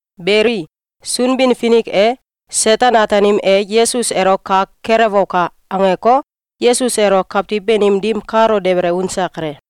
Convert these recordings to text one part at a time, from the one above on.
Beli, Sunbin-Finik e “Seten-Ataanim e Yesus elo kak kelewoka!”, angeko, Yesus elo kawtiw banim dim kalo dabele unse kale.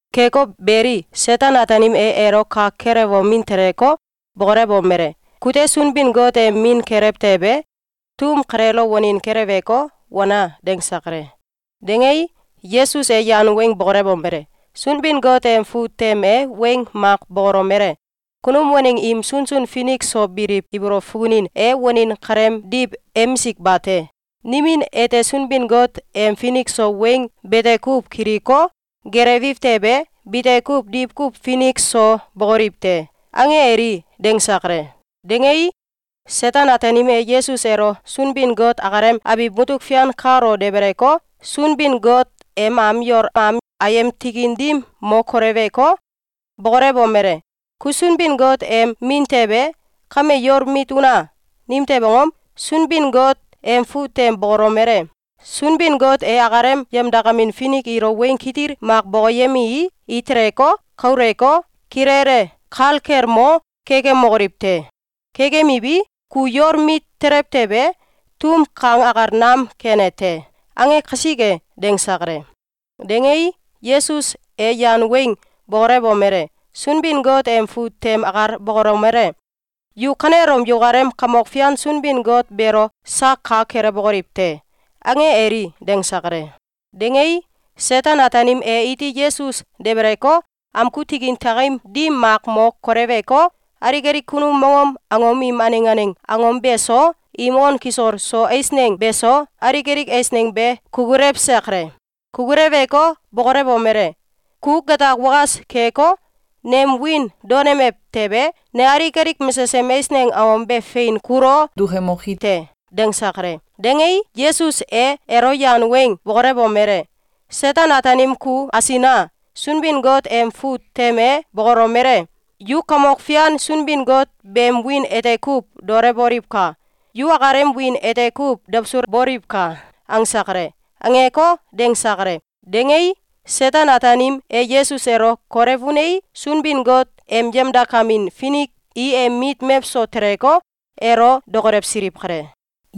Keko beli, Seten-Ataanim e elo kak kelewomin teleko, bokolewomele: “Kute Sunbin-Got em Min kelew tewe, tum kaleelo wanin keleweko, wana!”, dangse kale. Dangei, Yesus e yan weng bokolewomele: “Sunbin-Got em fut tem e weng mak bokolomele: ‘Kunum waneng im sunsun finik so biliw ibolow fukunin e wanin kaleemdiw emisik bate! Nimin ete Sunbin-Got em finik so weng bete kuw kiliko, gelewiw tewe, bite kuw diwkuw finik so bókoliw te. ange eli!”, dangse kale. Dangei, Seten-Ataanim e Yesus elo Sunbin-Got akalem abiw mutuk fian kalo debeleko, Sunbin-Got em am yol am tikin dim mo koleweko, bokolewomele: “Ku Sunbin-Got em Min tewe, kame yol mit una! Nimtew angom? Sunbin-Got em fut tem bokolomele: ‘Sunbin-Got e akalem yemdakamin finik ilo weng kitil mak bokoyemei, i teleko, kauleko, kilele kalgelmo kekemokoliw te. Kekemiwi, ku yol mit telew tewe, tum kang akal nam kene te.’, ange kasike.”, dangse kale. Dangei, Yesus e yan weng bokolewomele: “Sunbin-Got em fut tem akal bokolomele: ‘Yu kanelom yukalem Kamok Fian Sunbin-Got beelo sak kak kelewbokoliw te!’, ange eli!”, dangse kale. Dangei, Seten-Ataanim e iti Yesus debeleko, amgu tikin tiakim dim mak mo koleweko, alik alik kunum mongom angom im aneng aneng angom beso, im on kisol so eisneng beso, alik alik eisneng be kukulewse kale. Kukuleweko, bokolewomele: “Ku gatak wakas keko, nem wiin daonemew tewe, ne alik alik mesesem eisneng angom be fein kulo dukemoki te!”, dangse kale. Dangei, Yesus e elo yan weng bokolewomele: “Seten-Ataanim ku asina! Sunbin-Got em fut tem e bokolomele: ‘Yu Kamok Fian Sunbin-Got beem wiin ete kuw daolewboliwka! Yu akalem wiin ete kuw dawsulboliwka!’, angse kale.”, angeko, dangse kale. Dangei, Seten-Ataanim e Yesus elo kolew unei, Sunbin-Got em yemdakamin finik i em mit mewso teleko, elo dokolewsiliw kale.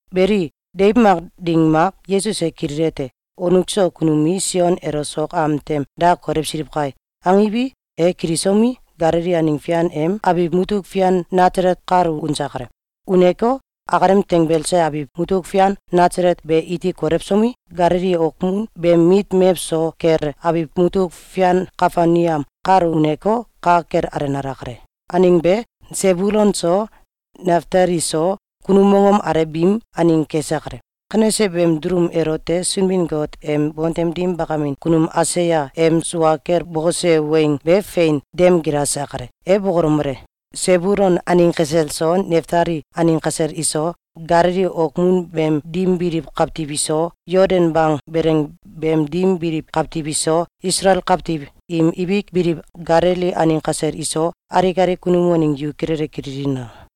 Beli, deiw mak ding mak, Yesus e kililete: “Wonuk so kunum i Sion elo sok am tem da kolewsiliw kai!”, angiwi, e kilisomi, Galili aneng fian em abiw mutuk fian Nasalet kalo unse kale. Uneko, akalem tanbelse abiw mutuk fian Nasalet be iti kolewsomi, Galili okmun beem mit mewso kele abiw mutuk fian Kafelneam kalo uneko, ka kel alenale kale. Aneng be, Sebulun so Naftali so, kunum mongom alew biim aneng kese kale. Kanese beem dulum elote Sunbin-Got em bontem dim kunum Aisaya em sua kel bokose weng be fein dem gilase kale. E bokolomele: “Sebulun aneng kasel so, Naftali aneng kasel iso, Galili okmun beem dim biliw kawtiw iso, Yoldan bang beleng beem dim biliw kawtiw iso, Isalael kawtiw im ibik biliw Galili aneng kasel iso, alik alik kunum waneng yu kilele kililina!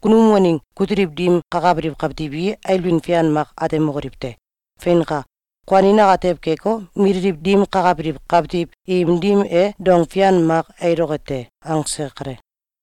Kunum waneng kutiliw dim kakabiliw kawtiw i ailbin fian mak atemokoliw te. Feinka! Kuanin atew keko, mililiw dim kakabiliw kawtiw im dim e dong fian mak ailoke te.”, angse kale.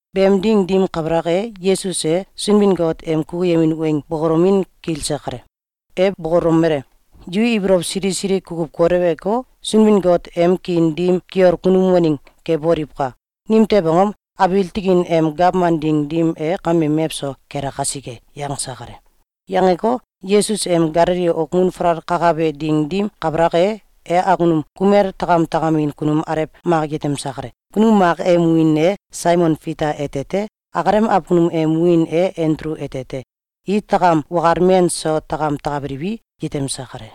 Beem ding dim kabalak e, Yesus e Sunbin-Got em kukuyemin weng bokolomin kilse kale. E bokolomele: “Yu ibolow sili sili kukuw koleweko, Sunbin-Got em kiin dim kiol kunum waneng keboliwka! Nimtew angom? Abiil tikin em gawman ding dim e kame mewso kele kasike.”, yangse kale. Yangeko, Yesus em Galili okmun falal kakabe ding dim kabalak e, e awkunum kumel takam takamin kunum alew mak yetemse kale. Kunum mak em wiin e Saimon Fita ete te. Akalem awkunum em wiin e Andulu ete te. I takam wakal men so takam takabiliwi, yetemse kale.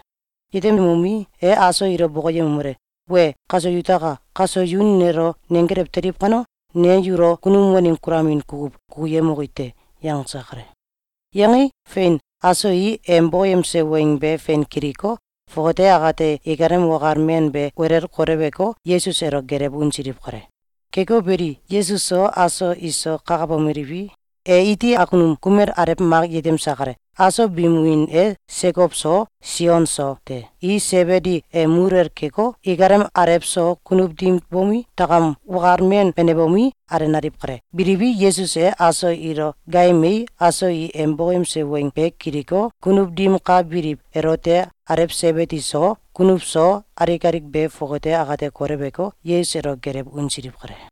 Yetemomi, e aso ilo bokoyemomele: “Wee! Kaso yutaka! Kaso yu nelo nenggelew teliw kano, ne yulo kunum waneng kulamin kukuw kukuyemoki te.”, yangse kale. Yangei, fein, aso i em bokoyemse weng be fein kiliko, fongate akate ikalem wakal men be welel koleweko, Yesus elo gelew unsiliw kale. Keko beli, Yesus so aso iso kakabomeliwi, e iti awkunum kumel alew mak yetemse kale. Aso biim wiin e Sekow so, Sion so te. I Sebidi em muluwel keko, ikalem alew so kunuw dim bomi, takam wakal men benebomi, alenaliw kale. Biliwi, Yesus e aso ilo gaayemei, aso i em bokoyemse weng be kiliko, kunuw dim ka biliw elote alew Sebidi so, kunuw so, alik alik be fongate akate koleweko, Yesus elo gelew unsiliw kale.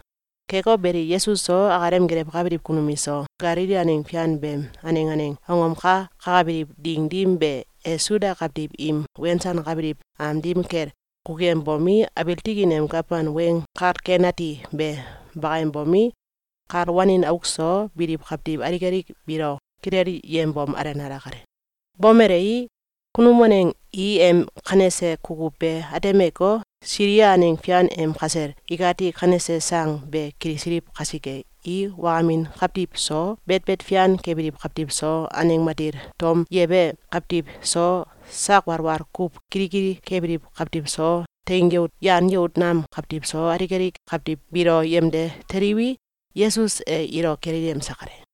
Keko beli, Yesus so, akalem gelewkabiliw kunum iso, Galili aneng fian beem aneng aneng angom ka kakabiliw ding dim be, e Suda kawtiw im wensankabiliw am dim kel kukuyembomi, abiil tikin em gawman Weng Kal Ken Ati be bakayembomi, kal wanin auk so biliw kawtiw alik alik biilo kilelyembom, alenale kale. Bomelei, kunum waneng i em kanese kukuw be atemeko, Silia aneng fian em kasel ikati kanese sang be kilisiliw kasike, i wakamin kawtiw so, betbet fian kebiliw kawtiw so, aneng matil tom yebe kawtiw so, sak walwal kuw kilikili kebiliw kawtiw so, teing yout yan yout nam kawtiw so, alik alik kawtiw biilo yemde teliwi, Yesus e ilo kilelyemse kale.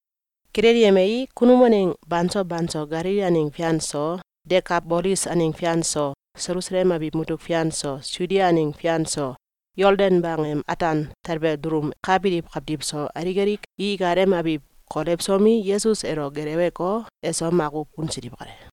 Kilelyemei, kunum waneng banso banso Galili aneng fian so, Dekabolis aneng fian so, Selusalem abiw mutuk fian so, Sudia aneng fian so, Yoldan bang em ataan talbe dulum ka biliw kawtiw so, alik alik i ikalem abiw kolewsomi, Yesus elo geleweko, eso makuw unsiliw kale.